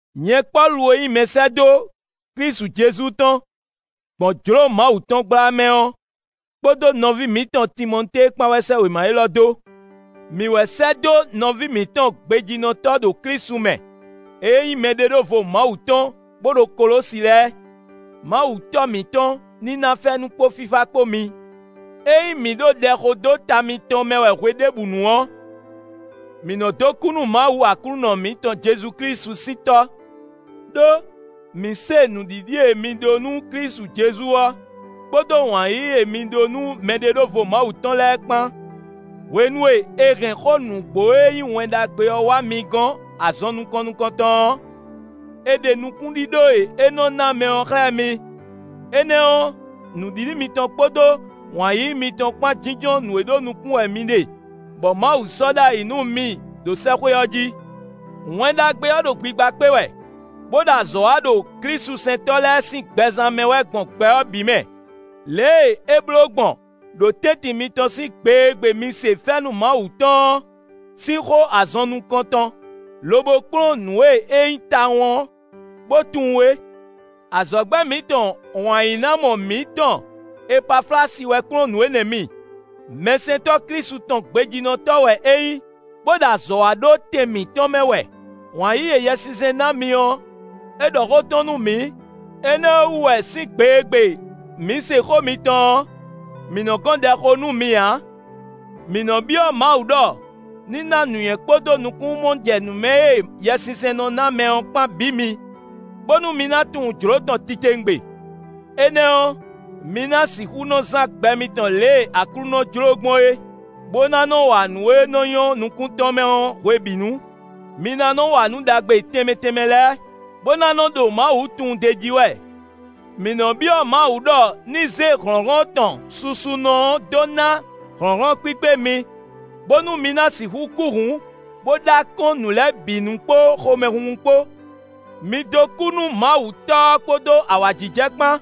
Nyɛ Pɔ́lu e nyí mɛsɛ́dó Klísu Jezu tɔn, gbɔn jlǒ Mawu tɔn gbla mɛ ɔ́, kpódó nɔví mǐtɔn Timɔtée kpán wɛ sɛ́ wěma élɔ́ dó. Mǐ wɛ sɛ́ dó nɔví mǐtɔn gbejínɔtɔ́ ɖo Klísu mɛ e nyí mɛɖeɖóvo Mawu tɔn bó ɖo Kolósi lɛ́ɛ. Mawu Tɔ́ mǐtɔn ní ná fɛ́nú kpó fífá kpó mi. Ényí mǐ ɖo ɖɛ xo dó ta mitɔn mɛ wɛ hweɖěbǔnu ɔ́, mǐ nɔ́ dó kú nú Mawu Aklúnɔ mǐtɔn Jezu Klísu sín Tɔ́. Đó, mǐ se nǔɖiɖi e mi ɖó nú Klísu Jezu ɔ́, kpódó wǎn yíyí e mi ɖó nú mɛɖeɖóvo Mawu tɔn lɛ́ɛ kpán. Hwenu e è hɛn xó nǔgbó e nyí Wɛn Ɖagbe ɔ́ wá mi gɔn azɔn nukɔn nukɔntɔn ɔ́, è ɖe nukúnɖíɖó e é nɔ ná mɛ ɔ́ xlɛ́ mi. Énɛ́ ɔ́, nǔɖiɖi mitɔn kpódó wǎn yíyí mitɔn kpán jínjɔ́n nǔ e ɖó nukún wɛ mi ɖe, bɔ Mawu sɔ́ ɖ'ayǐ nú mi ɖo sɛ́xwé ɔ́ jí. Wɛn Ɖagbe ɔ́ ɖo gbigba kpé wɛ, bó ɖo azɔ̌ wa ɖo klísusɛntɔ́ lɛ́ɛ sín gbɛzán mɛ wɛ gbɔn gbɛ ɔ́ bǐ mɛ, lě e é bló gbɔn ɖo tɛ́ntin mitɔn sín gbe e gbe mi se fɛ́nú Mawu tɔn ɔ́ sín xó azɔn nukɔn tɔn, lobo kplɔ́n nǔ e é nyí tawun ɔ́, bó tunwun é. Azɔ̌gbɛ́ mǐtɔn wǎnyínámɔ mǐtɔn Epaflasi wɛ kplɔ́n nǔ énɛ́ mi; mɛsɛntɔ́ Klísu tɔn gbejínɔtɔ́ wɛ é nyí, bó ɖo azɔ̌ wa ɖó tɛn mǐtɔn mɛ wɛ. Wǎn yíyí e Yɛsinsɛn ná mi ɔ́, é ɖɔ xó tɔn nú mǐ. Énɛ́ ɔ́ wú wɛ sín gbe e gbe mǐ se xó mitɔn ɔ́, mǐ nɔ́ gɔn ɖɛ xó nú mi ǎ. Mǐ nɔ́ byɔ́ Mawu ɖɔ ní ná nǔnywɛ́ kpódó nukúnnú-mɔjɛnǔmɛ e Yɛsinsɛn nɔ ná mɛ ɔ́ kpán bǐ mi, bónú mi ná tunwun jlǒ tɔn titewungbe. Énɛ́ ɔ́, mi ná sixú nɔ zán gbɛ mitɔn lě e Aklúnɔ jló gbɔn é, bó ná nɔ wa nǔ e nɔ́ nyɔ́ nukún tɔn mɛ ɔ́ hwebǐnu. Mi ná nɔ́ wa nǔ ɖagbe tɛnmɛ tɛnmɛ lɛ́ɛ, bó ná nɔ́ ɖo Mawu tunwun d'é jí wɛ. Mǐ nɔ byɔ́ Mawu ɖɔ ní zé hlɔ̌nhlɔ́n tɔn susunɔ ɔ́ dó ná hlɔ̌nhlɔ́n kpíkpé mi, bónú mi ná sixú kú hǔn bó ɖó akɔ́n nǔ lɛ́ɛ bǐ nu kpó xomɛhunhun kpó. Mi dó kú nú Mawu Tɔ́ ɔ́ kpódó awǎjijɛ kpán,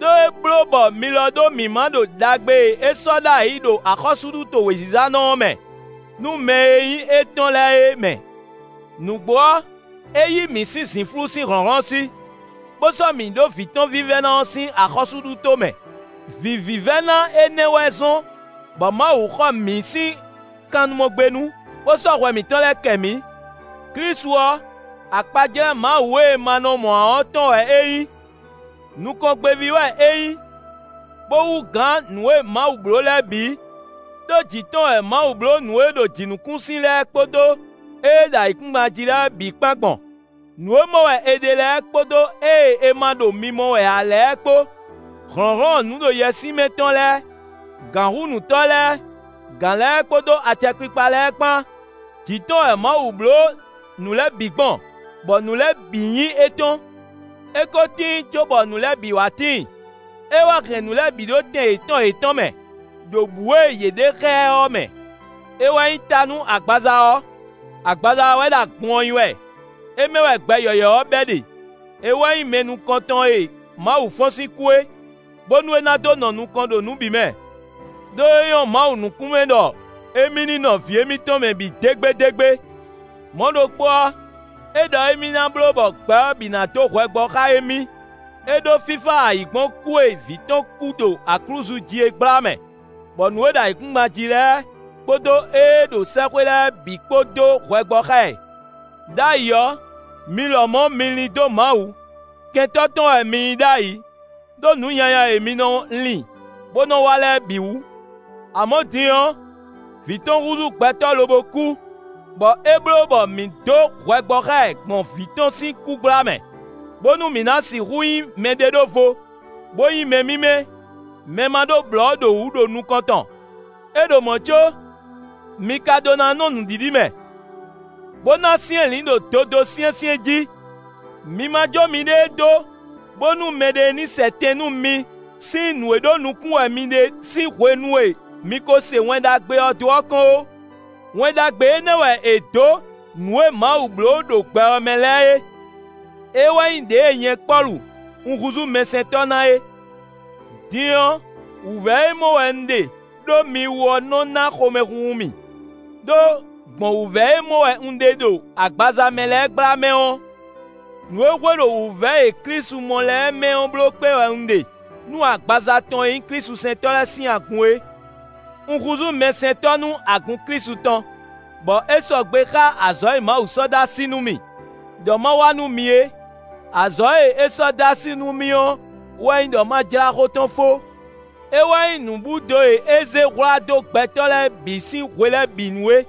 ɖó é bló bɔ mi lɔ ɖó mǐmá ɖo ɖagbe e é sɔ́ ɖ'ayǐ ɖo axɔ́súɖuto wězizanɔ ɔ́ mɛ, nú mɛ e nyí étɔn lɛ́ɛ é mɛ. Nǔgbó ɔ́, é yí mǐ sín zǐnflú sín hlɔ̌nhlɔ́n sí, bó sɔ́ mǐ ɖó Vǐ tɔn vívɛ́ná ɔ́ sín axɔ́súɖuto mɛ. Vǐ vívɛ́ná énɛ́ wɛ zɔ́n, bɔ Mawu xɔ mǐ sín kannumɔgbénu, bó sɔ́ hwɛ mǐtɔn lɛ́ɛ kɛ mǐ. Klísu ɔ́, akpajlɛ́ Mawu e è ma nɔ mɔ ǎ ɔ́ tɔn wɛ é nyí. Nukɔngbéví wɛ é nyí, bó hú gǎn nǔ e Mawu bló lɛ́ɛ bǐ. Đó jǐ tɔn wɛ Mawu bló nǔ e ɖo jǐnukúnsin lɛ́ɛ kpódó ée ɖo ayǐkúngban jí lɛ́ɛ bǐ kpán gbɔn: nǔ e mɔ wɛ è ɖe lɛ́ɛ kpódó ée è ma ɖo mimɔ wɛ ǎ lɛ́ɛ kpó, hlɔ̌nhlɔ́n nǔɖoyɛswímɛ tɔn lɛ́ɛ, gǎnhúnǔtɔ́ lɛ́ɛ, gǎn lɛ́ɛ kpódó acɛkpikpa lɛ́ɛ kpán; jǐ tɔn wɛ Mawu bló nǔ lɛ́ɛ bǐ gbɔn, bɔ nǔ lɛ́ɛ bǐ nyí étɔn. É ko tíin cóbɔ nǔ lɛ́ɛ bǐ wá tíin; é wɛ hɛn nǔ lɛ́ɛ bǐ ɖó tɛn yětɔn yětɔn mɛ, ɖo bǔ e yě ɖe xá ɛ ɔ́ mɛ. É wɛ nyí ta nú agbaza ɔ́: agbaza ɔ́ wɛ ɖo agun ɔ́ nyí wɛ; é mɛ wɛ gbɛ yɔ̌yɔ́ ɔ́ bɛ́ ɖe; é wɛ nyí mɛ nukɔn tɔn e Mawu fɔ́n sín kú é, bónú é ná dó nɔ nukɔn ɖo nǔ bǐ mɛ. Đó é nyɔ́ Mawu nukún mɛ ɖɔ émí ní nɔ Vǐ émítɔn mɛ bǐ dégbédégbé. Mɔ̌ ɖokpó ɔ́, é ɖɔ émí ná bló bɔ gbɛ ɔ́ bǐ ná dó hwɛ gbɔ xá émí; é ɖó fífá ayǐ gbɔn kú e Vǐ tɔn kú ɖo aklúzu jí é gbla mɛ, bɔ nǔ e ɖo ayǐkúngban jí lɛ́ɛ, kpódó ée ɖo sɛ́xwé lɛ́ɛ bǐ kpó dó hwɛ gbɔ xá ɛ. Đ'ayǐ ɔ́, mi lɔmɔ̌ mi lín dó Mawu; kɛntɔ́ tɔn wɛ mi nyí ɖ'ayǐ, ɖó nǔ nyanya e mi nɔ lin, bó nɔ wa lɛ́ɛ bǐ wú. Amɔ̌ din ɔ́, Vǐ tɔn húzú gbɛtɔ́ lobo kú, bɔ é bló bɔ mǐ dó hwɛ gbɔ xá ɛ gbɔn Vǐ tɔn sín kú gbla mɛ, bónú mi ná sixú nyí mɛɖeɖóvo, bó nyí mɛ mímɛ́, mɛ ma ɖó blɔ̌ ɖo wǔ ɖo nukɔn tɔn. É ɖo mɔ̌ có, mi ka ɖó ná nɔ nǔɖiɖi mɛ, bó ná syɛ́nlǐn ɖo dodó syɛ́nsyɛ́n jí; mi ma jó miɖée dó bónú mɛɖé ní sɛ tɛn nú mi sín nǔ e ɖó nukún wɛ mi ɖe sín hwenu e mi ko se Wɛn Ɖagbe ɔ́ dó ɔ́ kɔn ó. Wɛn Ɖagbe énɛ́ wɛ è dǒ nǔ e Mawu bló ɖo gbɛ ɔ́ mɛ lɛ́ɛ é; é wɛ nyí ɖěe nyɛ Pɔ́lu, un húzú mɛsɛntɔ́ ná é. Din ɔ́, wǔvɛ́ e mɔ wɛ un ɖe ɖó mi wú ɔ́ nɔ ná xomɛhunhun mì. Đó, gbɔn wǔvɛ́ e mɔ wɛ un ɖe ɖo agbaza mɛ lɛ́ɛ gbla mɛ ɔ́, nǔ e hwe ɖo wǔvɛ́ e Klísu mɔ lɛ́ɛ mɛ ɔ́ bló kpé wɛ un ɖe nú agbaza tɔn e nyí klísusɛntɔ́ lɛ́ɛ sín agun é. Un húzú mɛsɛntɔ́ nú agun Klísu tɔn, bɔ é sɔgbe xá azɔ̌ e Mawu sɔ́ dó así nú mì, ɖɔ ma wa nú mi é: azɔ̌ e é sɔ́ dó así nú mì ɔ́ wɛ nyí ɖɔ ma jlá xó tɔn fó. É wɛ nyí nǔbúdo e é zé hwlá dó gbɛtɔ́ lɛ́ɛ bǐ sín hwe lɛ́ɛ bǐ nu é;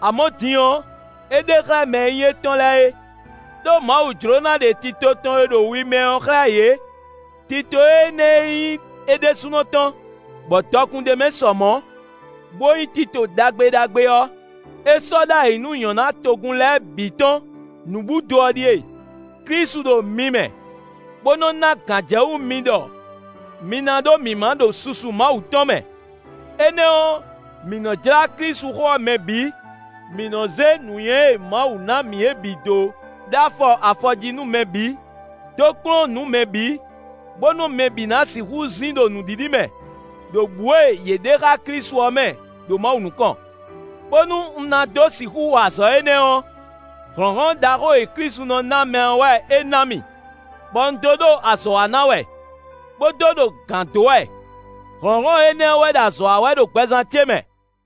amɔ̌ din ɔ́, é ɖe xlɛ́ mɛ e nyí étɔn lɛ́ɛ é. Đó Mawu jló ná ɖe tito tɔn e ɖo wi mɛ ɔ́ xlɛ́ yě; tito énɛ́ e nyí é ɖésúnɔ tɔn, bɔ dɔkun ɖ'é mɛ sɔ mɔ̌, bó nyí tito ɖagbe ɖagbe ɔ́, é sɔ́ ɖ'ayǐ nú nyɔ̌ná togun lɛ́ɛ bǐ tɔn. Nǔbúdo ɔ́ ɖíe: Klísu ɖo mi mɛ, bó nɔ́ ná gǎnjɛwú mi ɖɔ mi ná ɖó mǐmá ɖo susu Mawu tɔn mɛ. Énɛ́ ɔ́, mǐ nɔ jlá Klísuxó ɔ́ mɛ bǐ; mǐ nɔ́ zé nǔnywɛ́ e Mawu ná mǐ ɔ́ bǐ dó ɖó afɔ afɔ jí nú mɛ bǐ, dó kplɔ́n nǔ mɛ bǐ, bónú mɛ bǐ ná sixú zin ɖo nǔɖiɖi mɛ, ɖo bǔ e yě ɖe xá Klísu ɔ́ mɛ, ɖo Mawu nukɔn. Bónú un ná dó sixú wa azɔ̌ énɛ́ ɔ́, hlɔ̌nhlɔ́n ɖaxó e Klísu nɔ ná mɛ ɔ́ wɛ é ná mì, bɔ un dó ɖo azɔ̌ wa ná wɛ, bó dó ɖo gǎn dó wɛ; hlɔ̌nhlɔ́n énɛ́ ɔ́ wɛ ɖo azɔ̌ wa wɛ ɖo gbɛzán ce mɛ.